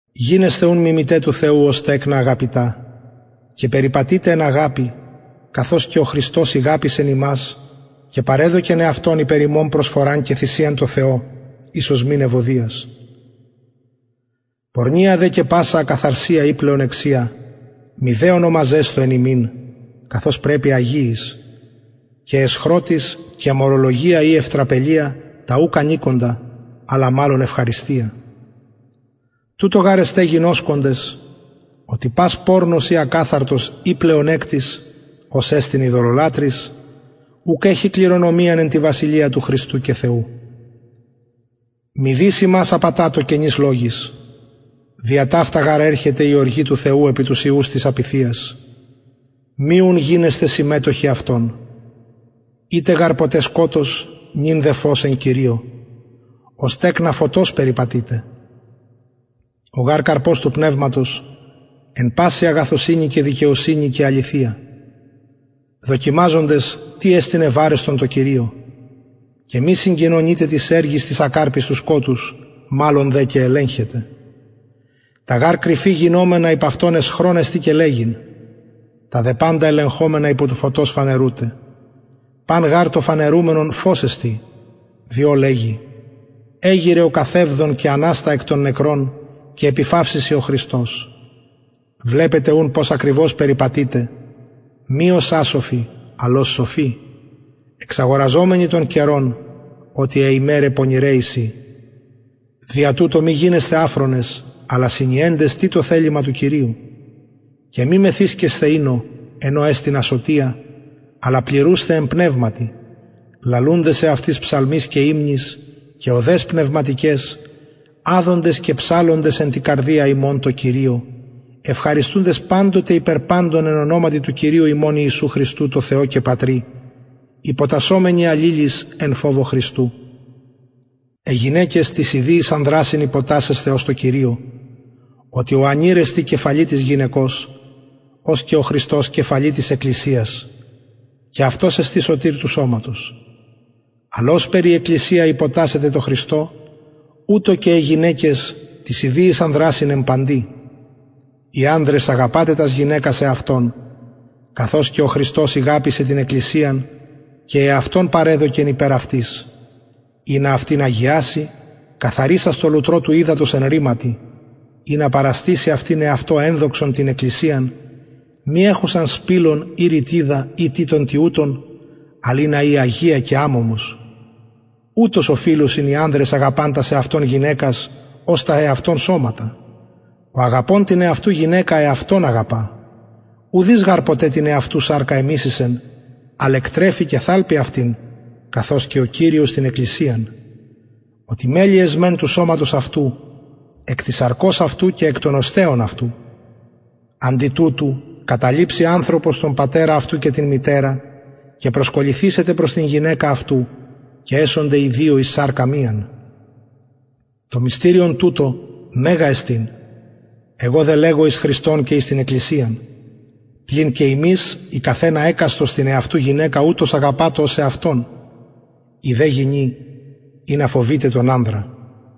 γινεσθε ουν μιμηται του θεου ως τεκνα αγαπητα και περιπατειτε εν αγαπη καθως και ο χριστος ηγαπησεν ημας και παρεδωκεν εαυτον υπερ ημων προσφοραν και θυσιαν τω θεω εις οσμην ευωδιας πορνεια δε και πασα ακαθαρσια η πλεονεξια μηδε ονομαζεσθω εν υμιν καθως πρεπει αγιοις και αισχροτης και μωρολογια η ευτραπελια τα ουκ ανηκοντα αλλα μαλλον ευχαριστια τουτο γαρ εστε γινωσκοντες οτι πας πορνος η ακαθαρτος η πλεονεκτης ος εστιν ειδωλολατρης ουκ εχει κληρονομιαν εν τη βασιλεια του χριστου και θεου μηδεις υμας απατατω κενοις λογοις δια ταυτα γαρ ερχεται η οργη του θεου επι τους υιους της απειθειας μη ουν γινεσθε συμμετοχοι αυτων ητε γαρ ποτε σκοτος νυν δε φως εν κυριω ως τεκνα φωτος περιπατειτε ο γαρ καρπος του πνευματος εν παση αγαθωσυνη και δικαιοσυνη και αληθεια δοκιμαζοντες τι εστιν ευαρεστον τω κυριω και μη συγκοινωνειτε τοις εργοις τοις ακαρποις του σκοτους μαλλον δε και ελεγχετε τα γαρ κρυφη γινομενα υπ αυτων αισχρον εστιν και λεγειν τα δε παντα ελεγχομενα υπο του φωτος φανερουται παν γαρ το φανερουμενον φως εστιν διο λεγει εγειρε ο καθευδων και αναστα εκ των νεκρων και επιφαυσει σοι ο χριστος βλεπετε ουν πως ακριβως περιπατειτε μη ως ασοφοι αλλ ως σοφοι εξαγοραζομενοι τον καιρον οτι αι ημεραι πονηραι εισιν δια τουτο μη γινεσθε αφρονες αλλα συνιεντες τι το θελημα του κυριου και μη μεθυσκεσθε οινω εν ω εστιν ασωτια αλλα πληρουσθε εν πνευματι λαλουντες εαυτοις ψαλμοις και υμνοις και ωδαις πνευματικαις αδοντες και ψαλλοντες εν τη καρδια υμων τω κυριω ευχαριστουντες παντοτε υπερ παντων εν ονοματι του κυριου ημων ιησου χριστου τω θεω και πατρι υποτασσομενοι αλληλοις εν φοβω χριστου αι γυναικες τοις ιδιοις ανδρασιν υποτασσεσθε ως τω κυριω οτι ανηρ εστιν κεφαλη της γυναικος ως και ο χριστος κεφαλη της εκκλησιας και αυτος εστιν σωτηρ του σωματος αλλ ωσπερ η εκκλησια υποτασσεται τω χριστω ουτως και αι γυναικες τοις ιδιοις ανδρασιν εν παντι οι ανδρες αγαπατε τας γυναικας εαυτων καθως και ο χριστος ηγαπησεν την εκκλησιαν και εαυτον παρεδωκεν υπερ αυτης ινα αυτην αγιαση καθαρισας τω λουτρω του υδατος εν ρηματι ινα παραστηση αυτην εαυτω ενδοξον την εκκλησιαν μη εχουσαν σπιλον η ρυτιδα η τι των τοιουτων αλλ ινα η αγια και αμωμος ουτως οφειλουσιν οι ανδρες αγαπαν τας εαυτων γυναικας ως τα εαυτων σωματα ο αγαπων την εαυτου γυναικα εαυτον αγαπα ουδεις γαρ ποτε την εαυτου σαρκα εμισησεν αλλ εκτρεφει και θαλπει αυτην καθως και ο κυριος την εκκλησιαν οτι μελη εσμεν του σωματος αυτου εκ της σαρκος αυτου και εκ των οστεων αυτου αντι τουτου καταλειψει ανθρωπος τον πατερα αυτου και την μητερα και προσκολληθησεται προς την γυναικα αυτου και εσονται οι δυο εις σαρκα μιαν το μυστηριον τουτο μεγα εστιν εγω δε λεγω εις χριστον και εις την εκκλησιαν πλην και υμεις οι καθ ενα εκαστος την εαυτου γυναικα ουτως αγαπατω ως εαυτον η δε γυνη ινα φοβηται τον ανδρα